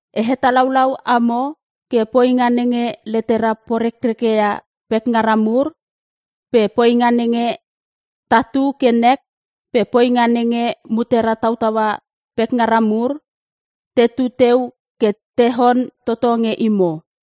E hetalaulau amo ke poinga nenge letera porekrekeia pekngara mur pe poinga nenge tatu ke nek pe poinga nenge mutera tautaua pekngara mur tetu teu ke tehon toto nge imo.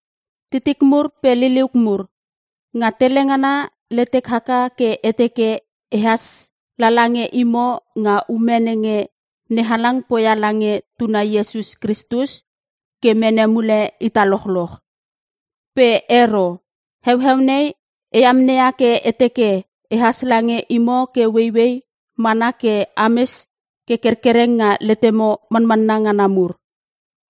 Titik mur pe liliuk mur, nga tele ngana letek haka ke e teke e has lala nge imo nga ume nenge NeHalang poia lange Tuna Iesus Kristus ke mene mule ita lochloch. Pe ero. Heueu nei e amneia ke e teke ehas lange imo ke ueiuei mana ke ames ke kerkereng nga letemo manmanna ngana mur.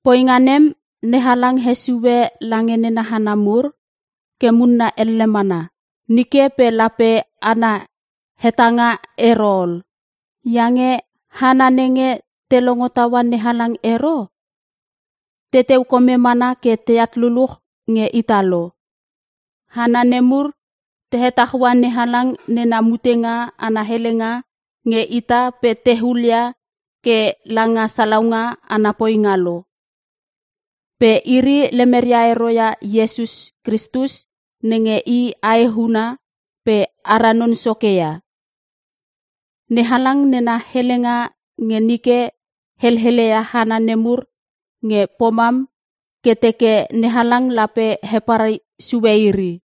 Poinga nem NeHalang hesue lange nena hana mur ke munna elle mana nike pe lape ana hetanga ero ol. Iange hana nenge te longo taua NeHalang ero, teteu kome mana ke teat luluch nge ita lo. Hana nemur tehetaua NeHalang nena mutenga ana helenga nge ita pe te hulia ke langa salaunga ana poinga lo. Pe iri lemeria ero ia Iesus Kristus nenge I Aehuna pe ara Non Soke ia. NeHalang nena helenga nge nike heleleia hana nemur nge pomam ke teke NeHalang lape heparai sue iri.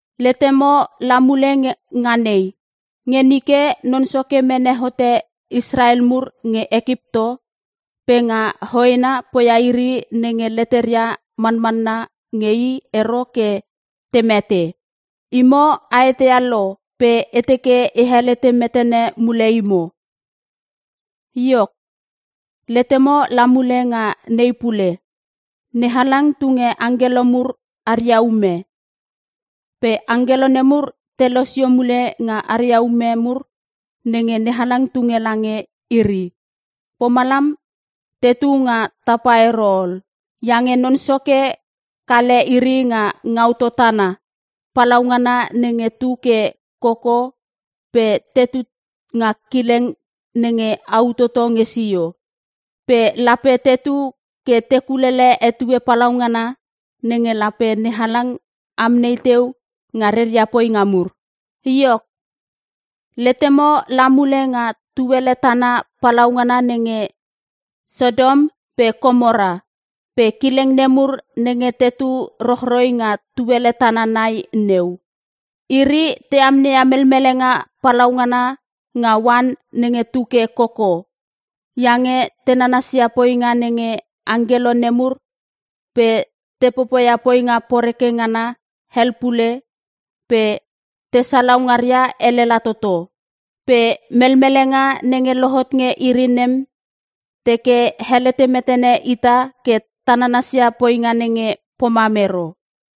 Letemo la mule nga nei. Nge nike Non Soke mene hote Israel mur nge Ekipto pe nga hoena poia iri nenge leteria manmanna nge I ero ke te mete. Imo a eteia lo pe e teke e helete metene mule imo. Iok, letemo la mule nga nei pule. NeHalang tunge angkelo mur aria ume. Pe angkelo nemur te losio mule nga aria ume mur nenge NeHalang tunge lange iri; pomalam tetu nga tapa ero ol. Iange Non Soke kale iri nga ngautou tana palaungana nenge tu ke koko pe tetu nga kileng nenge au toto nge sio. Pe lape tetu ke te kulele etue palaungana nenge lape NeHalang amnei teu nga reria poinga mur. Iok, letemo la mule nga tuele tana palaungana nenge Sotom pe Komora pe kileng nemur nenge tetu rochroi nga tuele tana nai neu. Iri te amneia melmelenga palaungana nga oan nenge tuke koko, iange te nanasia poinga nenge angkelo nemur pe te popoia poinga poreke ngana hel pule pe te salau ngaria elela toto. Pe melmelenga nenge lohot nge iri nem teke helete metene ita ke ta nanasia poinga nenge pomam ero.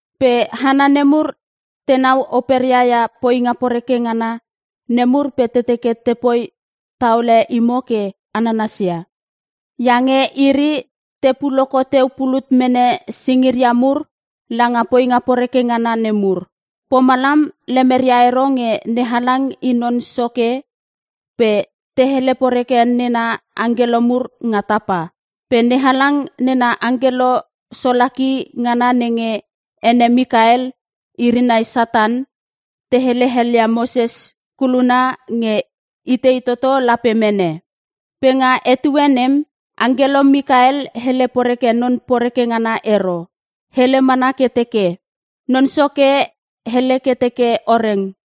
Pe hana nemur tenau operia ia poinga poreke ngana nemur pe te teke tepoi taole imo ke a nananasia. Iange iri te puoloko teu pulut mene singiria mur langa poinga poreke ngana nemur. Pomalam lemeria ero nge NeHalang I Non Soke pe te hele poreke nena angkelo mur nga tapa. Pe NeHalang nena angkelo solaki ngana nenge ene Mikael iri nai Satan te hele helia Moses koluna nge itei toto lape mene. Pe nga etue nem, angkelo Mikael hele poreke Non Poreke ngana ero. Hele mana ke teke, “Non Soke hele ke teke o reng!”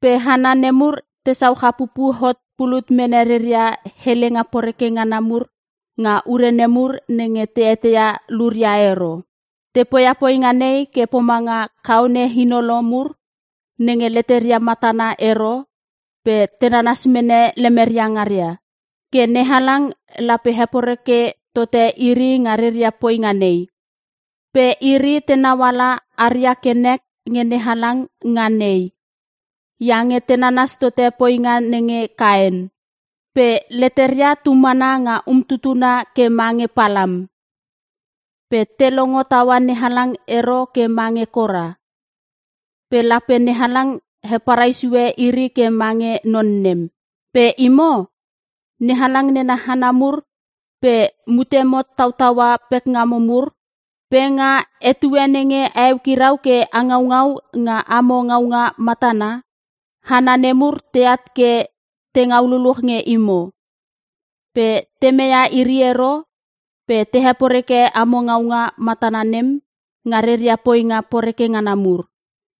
Pe hana nemur tesau chapupu hot pulut mene reria helenga poreke ngana mur nga ure nemur nenge te eteia luria ero. Te poia poinga nei ke pomanga kaone inolo mur nenge leteria matana ero pe te nanas mene lemeria ngaria. Ke NeHalang lape heporeke tote iri nga reria poinga nei. Pe iri tenau ala aria ke nek nge NeHalang nga nei, iange te nanas tote poinga nenge Kaen! Pe leteria tumana nga umtutuna ke mange Palam. Pe te longo taua NeHalang ero ke mange Kora. Pe lape NeHalang heparai sue iri ke mange non nem. Pe imo, NeHalang nena hana mur pe mutemo tautaua pekngamo mur. Pe nga etue nenge a eukirau ke a ngaungau nga amo ngaunga matana, hana nemur teat ke te ngau luluch nge imo. Pe te meia iri ero pe te heporeke amo ngaunga matana nem nga reria poinga poreke ngana mur.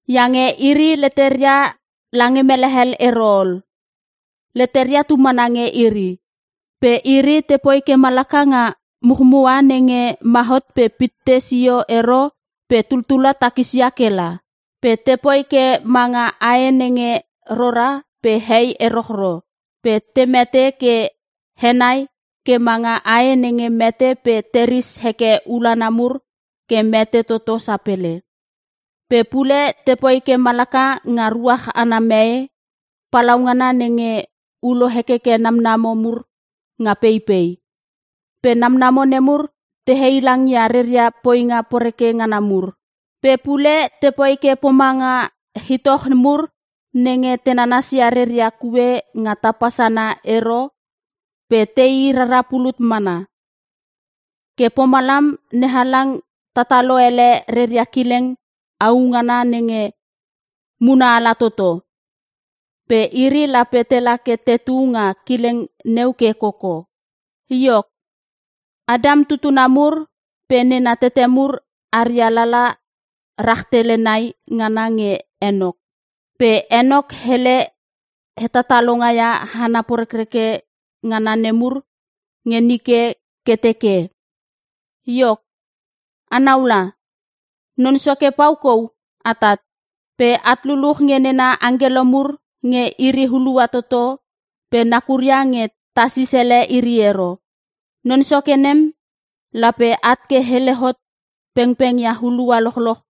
Iange iri leteria lange mele hel ero ol, leteria tumana nge iri. Pe iri tepoi ke malaka nga muchmua nenge ma hot pe pitte sio ero pe tuttula takisia kela. Pe tepoi ke manga ae nenge rora pe hei erochro pe te mete ke henai ke manga ae nenge mete pe teris heke ulanlana mur ke mete toto sapele. Pe pule tepoi ke malaka nga ruach ana mee papalauna nenge ulo hekeke namnamo mur nga peipei. Pe namnamo nemur te heilangia reria poinga poreke ngana mur. Pe pule tepoi ke pomanga itoch mur nenge te nanasia reria kue nga tapa sana ero pe tei rara pulut mana. Ke pomalam NeHalang tatalo ele reria kileng au ngana nenge munaala toto. Pe iri lape tela ke tetu nga kileng neu ke koko. Iok, Antam tutuna mur pe nena tete mur aria lala rahtele nai ngana nge Enok. Pe Enok hele hetatalonga ia hana porekreke ngana nemur nge nike ke teke, “Iok a naula, Non Soke pau kou atat. Pe at luluch nge nena angkelo mur nge iri hulua toto pe nakura nge tasis ele iri ero. Non Soke nem lape at ke hele hot pengpengia hulua lochloch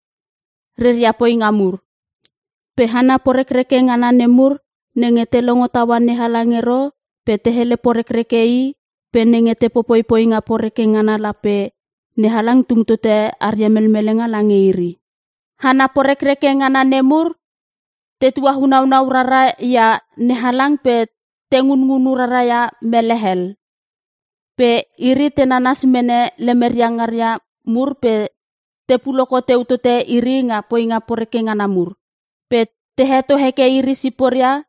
reria poinga mur. Pe hana porekreke ngana nemur nenge te longo taua NeHalang ero pe te hele porekreke I pe nenge te popoi poinga poreke ngana, lape NeHalang tung tote aria melmelenga lange iri.” Hana porekreke ngana nemur te tuainaunau rara ia NeHalang pe te ngunngunu rara ia mele hel. Pe iri te nanas mene lemeria ngaria mur pe te puoloko teu tote iri nga poinga poreke ngana mur. Pe te heto hekeke iri siporia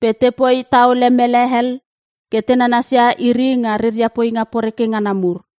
pe tepoi taolole mele hel ke te nanasia iri nga reria poinga poreke ngana nemur.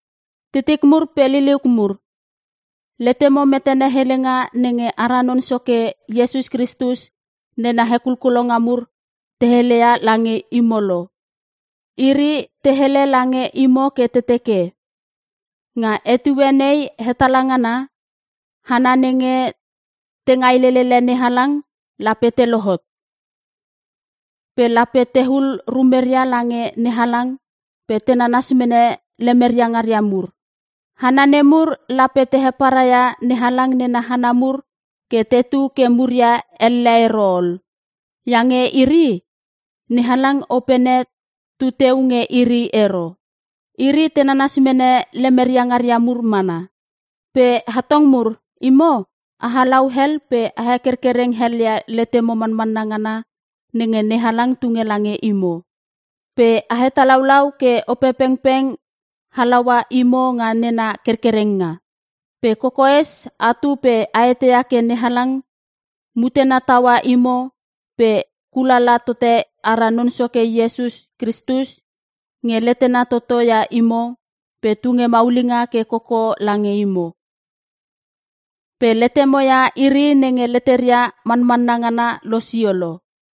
Titik mur pe liliuk mur, letemo metene helenga nenge ara Non Soke Iesus Kristus nena hekulkulonga mur te heleia lange imo lo. Iri te hele lange imo ke te teke, “Nga etue nei hetala ngana, hana nenge te ngailelele NeHalang lape te lohot. Pe lape tehul rumeria lange NeHalang pe te nanas mene lemeria ngaria mur.” Hana nemur lape te heparaia NeHalang nena hana mur ke tetu ke muria elle ero ol. Iange iri, NeHalang Opene tuteu nge iri ero. Iri te nanas mene lemeria ngaria mur mana. Pe atong mur imo, a halau hel pe a hekerkereng helia letemo manmanna ngana nenge NeHalang tunge lange imo. Pe a hetalaulau ke Opepengpeng halaua imo nga nena kerkerenga. Pe kokoes atu pe a eteia ke NeHalang mutena taua imo pe a kulala tote ara Non Soke Iesus Kristus nge letena toto ia imo pe tunge maulinga ke koko lange imo. Pe letemo ia iri nenge leteria manmanna ngana losio lo.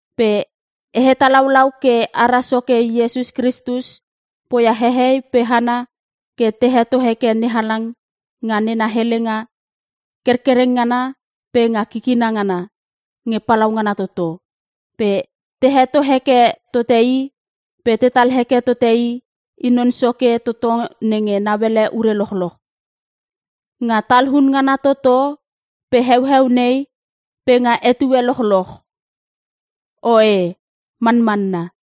Pe e hetalaulau ke ara Soke Iesus Kristus poia hehei pe hana ke te heto heke NeHalang nga nena helenga kerkereng ngana pe nga kikina ngana nge palaungana toto. Pe te heto heke tote i pe tetal heke tote ke i Non Soke toto nenge nauele ure lochloch, nga talun ngana toto pe heueu nei pe nga etue lochloch! Oe, Manmanna!